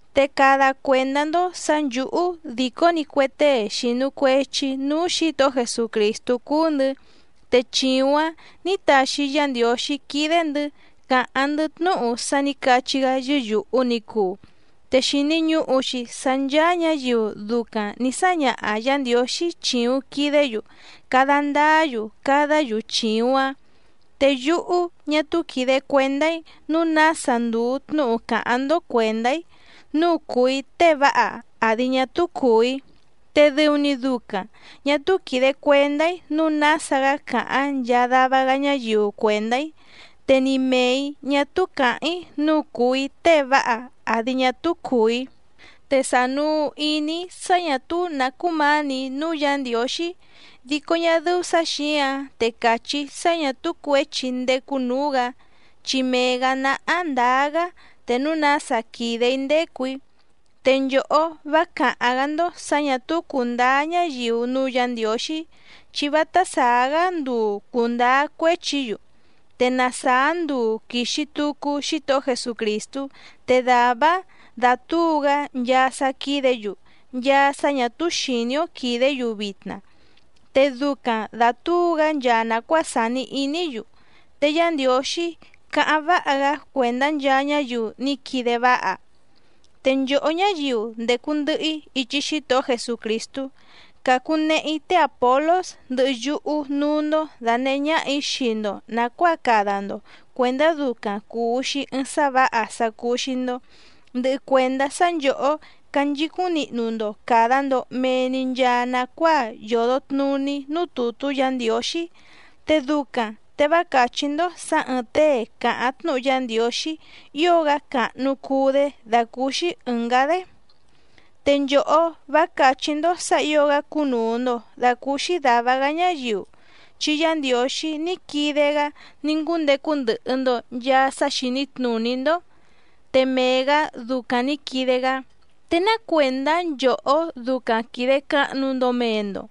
Te cada cuèndá‑ndó sǎ nchǔhú dìcó‑ni cue tée xìnu cuechi núú Xǐtohó Jesucrìstú cúú‑ndɨ̌, te chìuⁿ‑áⁿ nǐ taxi Yá Ndiǒxí quídé‑ndɨ̌ càháⁿ‑ndɨ́ tnúhu sá nǐ cachí‑gá yɨ́yùhu ni cuu. Te xìni ñuhu‑xi sá ncháá ñǎyiu ducaⁿ nǐ sáñaha Yǎ Ndiǒxí chìuⁿ quidé‑yu cada ndáá‑yu cadá‑yu chìuⁿ‑áⁿ. Te yúhú ñá túú quìde cuendá‑í nǔu nása ndùu tnúhu càháⁿ‑ndó cuèndá‑í nǔu cùu‑í tée váha àdi ñá túú cùu‑í. Te dɨu‑ni ducaⁿ ñà túú quìde cuendá‑í nǔu nása‑gá càháⁿ nchaa dava‑gá ñáyiu cuèndá‑í. Te ni mèe‑í ñá túú càháⁿ‑í nǔu cùu‑í tée váha àdi ñá túú cùu‑í. Te sànuu iní‑í sá ñà túú nǎ cúmǎnì‑í núú Yǎ Ndiǒxí, dico ñá dɨ́ú sǎ xǐǎⁿ te cachí‑í sá ñǎ túú cuěchi‑í ndécú nǔú‑gǎ, chi mee‑gǎ náhá ndǎá‑gá te núu nása quìde‑í ndécù‑í. Te nchòhó vá càháⁿ‑gá‑ndó sǎ ñà túú cùndáá ñáyiu núú Yǎ Ndiǒxí, chi vátá sàá‑gá nduu cùndáá cuéchi‑yu. Te na sàá nduu quìxi tucu Xítohó Jesucrìstú te dàvá‑áⁿ dàtúu‑gá nchaa sá quídě‑yu, nchaa sá ñà túú xìní‑ó quìdé‑yu vitna, te ducaⁿ dàtúu‑gá nchaa nàcuáa sàni iní‑yu. Te Yá Ndiǒxí cáháⁿ váha‑gá cuèndá nchaa ñáyiu ní quide váha. Te nchòhó ñáyiu ndècu ndɨhɨ‑í ichi Xítohó Jesucrìstú, càcunehe‑í té Àpolós ndɨhɨ yúhú núú‑ndó dànehé ñáhà‑í xii‑ndo nàcuáa cada‑ndo cuèndá ducaⁿ cùu‑xi ɨɨⁿ sá vǎha sá cúú‑xí‑ndó, ndɨhɨ cuèndá sá nchòhó canchicúⁿ nihnu‑ndo càda‑ndo mee‑ni nchaa nacuáa yòdo tnuní núú tùtú Yǎ Ndiǒxí. Te ducaⁿ te vá càchí‑ndó sǎ ɨ̀ɨⁿ tée càháⁿ tnúhu Yá Ndiǒxí ío‑gá càhnu cuu‑dé dàcúúxí ɨ̀ngá‑dé. Te nchòhó vá càchí‑ndó sǎ ǐo‑gá cúnùu‑ndo dacúúxí dàva‑gá ñáyiu chi Yá Ndiǒxí ní quide‑gá ní ngúndecu ndɨhɨ‑ndo nchàa sá xìní tnùní‑ndó. Te mee‑gǎ ducaⁿ nǐ quide‑gá ¿Te ná cuèndá nchòhó ducaⁿ quìde cahnu‑ndo mee‑ndo?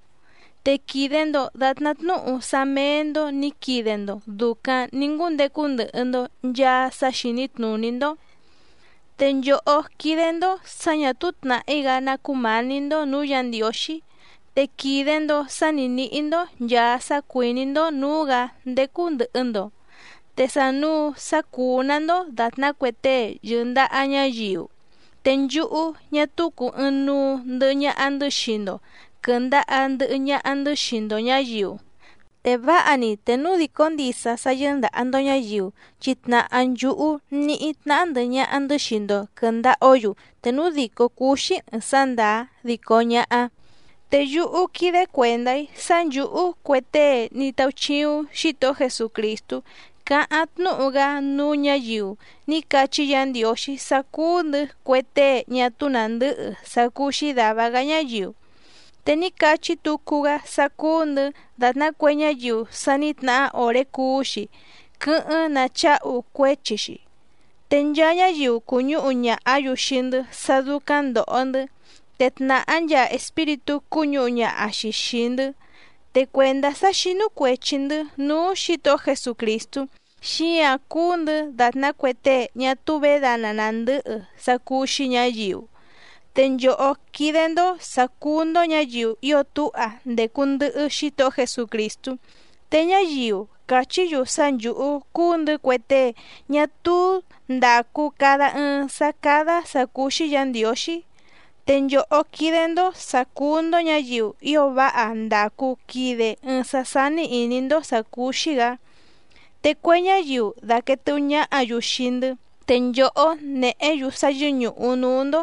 Te quìde‑ndo datná tnúhu sá méé‑ndó nǐ quide‑ndo dùcaⁿ ní ngúndecu ndɨhɨ‑ndo nchàa sá xìní tnùní‑ndó. Te nchòhó quídé‑ndó sǎ ñà túú tnàhí‑gá ná cúmǎní‑ndó nǔú Yǎ Ndiǒxí, te quìde‑ndo sá ni nǐhí‑ndó nchàa sá cuìní‑ndó nǔú‑gǎ ndécú ndɨ̀hɨ‑ndo, te sànuu sá cúú‑nǎ‑ndó dàtná cue tée yɨ̀ndaha ñáyiu, te nchúhú ñá túú cùu ɨɨⁿnuu ndɨhɨ ñaha‑ndɨ́ xii‑ndo quɨ̀ndaha ndɨhɨ ñaha‑ndɨ́ xii‑ndo ñǎyiu, ¡te váha‑ni te núu dìcó ndisa sá yɨ́ndàha‑ndo ñáyiu chi tnàhá nchúhú ní tnahá ndɨ̀hɨ ñaha‑ndɨ́ xii‑ndo quɨ̀ndaha‑ó‑yu te núu dìcó cúú‑xí ɨ̀ɨⁿ sá ndàá dico ñáhá! Te yúhú quídé cuèndá‑í sá nchǔhú cue tée ní táúchíúⁿ Xǐtohó Jesucrìstú cáháⁿ tnúhu‑gá núú ñǎyiu ní cachí Yǎ Ndiǒxí sá cúú‑ndɨ̌ cue tée ñá túú nàndɨ́hɨ sá cúú‑xí dàva‑gá ñáyiu. Te ní cachí tucu‑gá sá cúú‑ndɨ̌ dàtná cue ñáyiu sa ní tnahá òré cuú‑xi quɨ́hɨ́ⁿ nacháhu cuéchi‑xi, te nchaa ñáyiu cùñúhu ñàhá‑yu xii‑ndɨ́ sá dúcáⁿ ndòho‑ndɨ́, te tnàhá nchaa espíritú cúñǔhu ñaha‑xi xìi‑ndɨ́. Te cuèndá sá xínú cuèchi‑ndɨ́ núú Xǐtohó Jesucrìstú, xíǎⁿ cúú‑ndɨ̌ dàtná cue tée ñá túú vědana nàndɨ́hɨ sá cúú‑xí ñǎyiu. Te nchòhó quídé‑ndó sǎ cúú‑ndó ñǎyiu ío túha ndècu ndɨhɨ Xítohó Jesucrìstú. Te ñáyiu càchí‑yu sá nchǔhú cúú‑ndɨ̌ cue tée ñá túú ndàcu cada ɨɨⁿ sá cádá sǎ cúú‑xí Yǎ Ndiǒxí. Te nchòhó quídé‑ndó sǎ cúú‑ndó ñǎyiu ío váha ndàcu quide ɨɨⁿ sá sání ìní‑ndó sǎ cúú‑xí‑gǎ. Te cue ñáyiu dàquee tɨhú ñáhǎ‑yu xii‑ndɨ́, te nchòhó néhě‑yu sá yɨ́ñùhu núú‑ndó.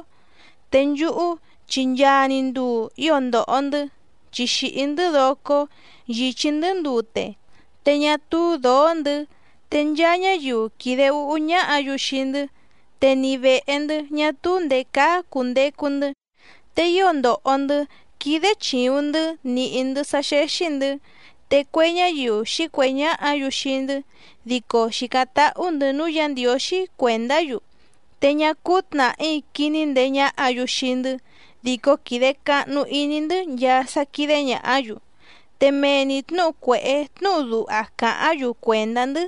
Te nchúhú chi nchaa‑ni nduu ío ndòho‑ndɨ́, chi xìhí‑ndɨ́ docó, yìchí‑ndɨ́ ndute, te ñá túú dǒó‑ndɨ̌, te nchaa ñáyiu quìde úhú ñáhǎ‑yu xii‑ndɨ́, te ni vèhe‑ndɨ́ ñá túú ndèé cáá cùndecu‑ndɨ́. Te ío ndòho‑ndɨ́ quídé chìuⁿ‑ndɨ́ nìhí‑ndɨ́ sá xéxí‑ndɨ̌. Te cue ñáyiu xǐcuèhé ñáhǎ‑yu xii‑ndɨ́ dico xìcáⁿ táhú‑ndɨ̌ núú Yǎ Ndiǒxí cuèndá‑yu, te ñá cúú tnàhí quiní ndeé ñáhǎ‑yu xii‑ndɨ́ dico quìde cahnu iní‑ndɨ́ nchaa sá quídé ñàhá‑yu. Te mee‑ni tnǔhu cuèhé tnúhu duha càháⁿ‑yu cuèndá‑ndɨ́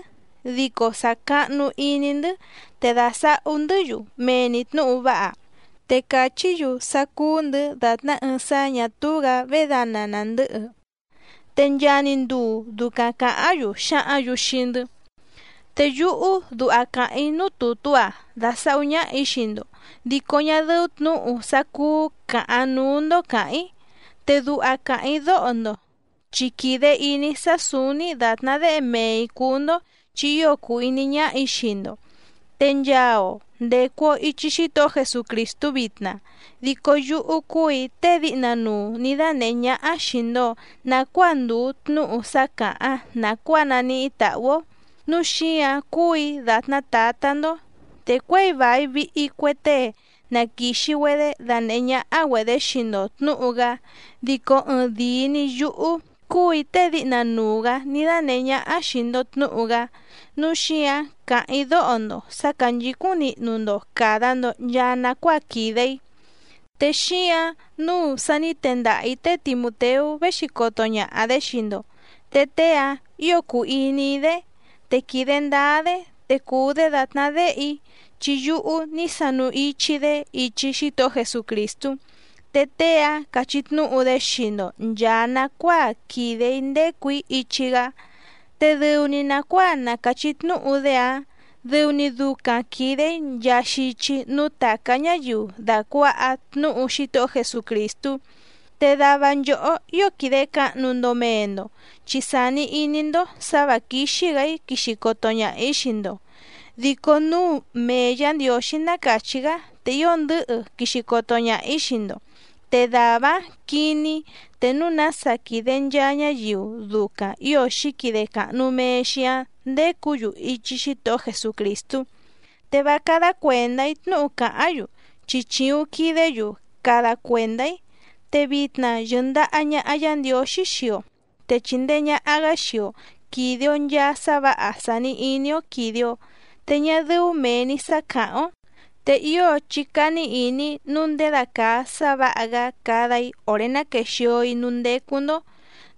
dico sàcahnu iní‑ndɨ́ te dàsahú‑ndɨ́‑yu mee‑ni tnǔhu váha. Te càchí‑yu sá cúú‑ndɨ̌ dàtná ɨɨⁿ sá ñà túú‑gǎ vědana nàndɨhɨ, te nchaa‑ni nduu ducaⁿ càháⁿ‑yu xǎhǎⁿ‑yu xii‑ndɨ́. Te yúhú duha càháⁿ‑í núú tùtú‑a dàsahú ñáhà‑í xii‑ndo, dico ñá dɨ́ú tnǔhu sá cúú càhaⁿ núú‑ndó càháⁿ‑í. Te duha càháⁿ‑í dóho‑ndo chi quìde iní‑í sá sǔúní dàtná déhe mee‑ǐ cúú‑ndó chi ío cùu iní ñáhà‑í xii‑ndo. Te nchaa‑o ndècu‑o ichi Xítohó Jesucrìstú vitna, dico yúhú cúù‑í tée díhna nuu nǐ dánèhé ñáhá xìi‑ndo nacuáa ndùu tnúhu sá càháⁿ nàcuáa naníhí tàhú‑ó, núu xíǎⁿ cúù‑í dàtná tǎtá‑ndó. Te cuěi vài vihi cue tée na quìxi‑güedé danèhé ñáhá‑güedě xii‑ndo tnǔhu‑gá dico ɨɨⁿ dìi‑ni yúhú cúù‑í tée díhna nuu‑gǎ ní dánèhé ñáhá xìi‑ndo tnúhu‑gá. Núu xíǎⁿ càháⁿ‑í dóho‑ndo sǎ cánchǐcúⁿ nihnu‑ndo càda‑ndo nchaa nacuáa quìde‑í. Te xíǎⁿ nǔu sa ní tendaha‑ǐ té Timùteú véxi coto ñaha‑dě xii‑ndo, te tée‑áⁿ ǐo cùu iní‑í‑dé te quìde ndáá‑dé, te cùu‑dé dàtná déhe‑í chi yúhú ní sanu ichi‑í‑dé ichi Xítohó Jesucrìstú, te tée‑áⁿ cachí tnúhu‑dé xii‑ndo nchàa nacuáa quìde‑í ndécù‑í ichi‑gá. Te dɨu‑ni nàcuáa na càchí tnúhu‑dé‑áⁿ dɨu‑ni ducaⁿ quìde‑í nchaa xichi núú tàcá ñáyiu dàcuaha tnúhu Xítohó Jesucrìstú. Te dava nchòhó ío quìde cahnu‑ndo mee‑ndo chi sàni iní‑ndó sǎ vǎ quíxí‑gǎ‑í quixi coto ñaha‑ǐ xii‑ndo. Dico núu mee Yǎ Ndiǒxí ná càchí‑gá te ío ndɨ̌hɨ quixi coto ñaha‑ǐ xii‑ndo, te dàvá‑áⁿ quiní‑í te núu nása quìde nchaa ñáyiu ducaⁿ ǐo xǐquide càhnu mee‑xi‑áⁿ ndécǔ‑yu ichi Xítohó Jesucrìstú. Te vá cádá cuèndá‑í tnúhu càháⁿ‑yu chi chìuⁿ quidé‑yu cada cuèndá‑í. Te vitna yɨ̀ndaha ñaha Yá Ndiǒxí xii‑o, te chìndee ñaha‑gá xii‑o quìde‑o nchaa sá vǎha sàni iní‑ó quìde‑o te ñá dɨ́ú mèe‑ni sá càháⁿ‑ó. Te ío chí cání ìní nǔu ndědacàa sá vǎha‑gá cada‑í òré ná quéxìo‑í núú ndécú‑ndó,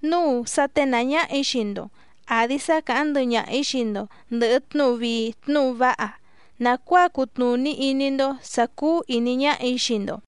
núu sá ténàá ñáhà‑í xii‑ndo àdi sá càháⁿ ndɨhɨ ñaha‑ǐ xii‑ndo ndɨ̀hɨ tnúhu vii tnúhu váha nàcuáa cutnùní iní‑ndó sǎ cúú ìní ñáhà‑í xii‑ndo.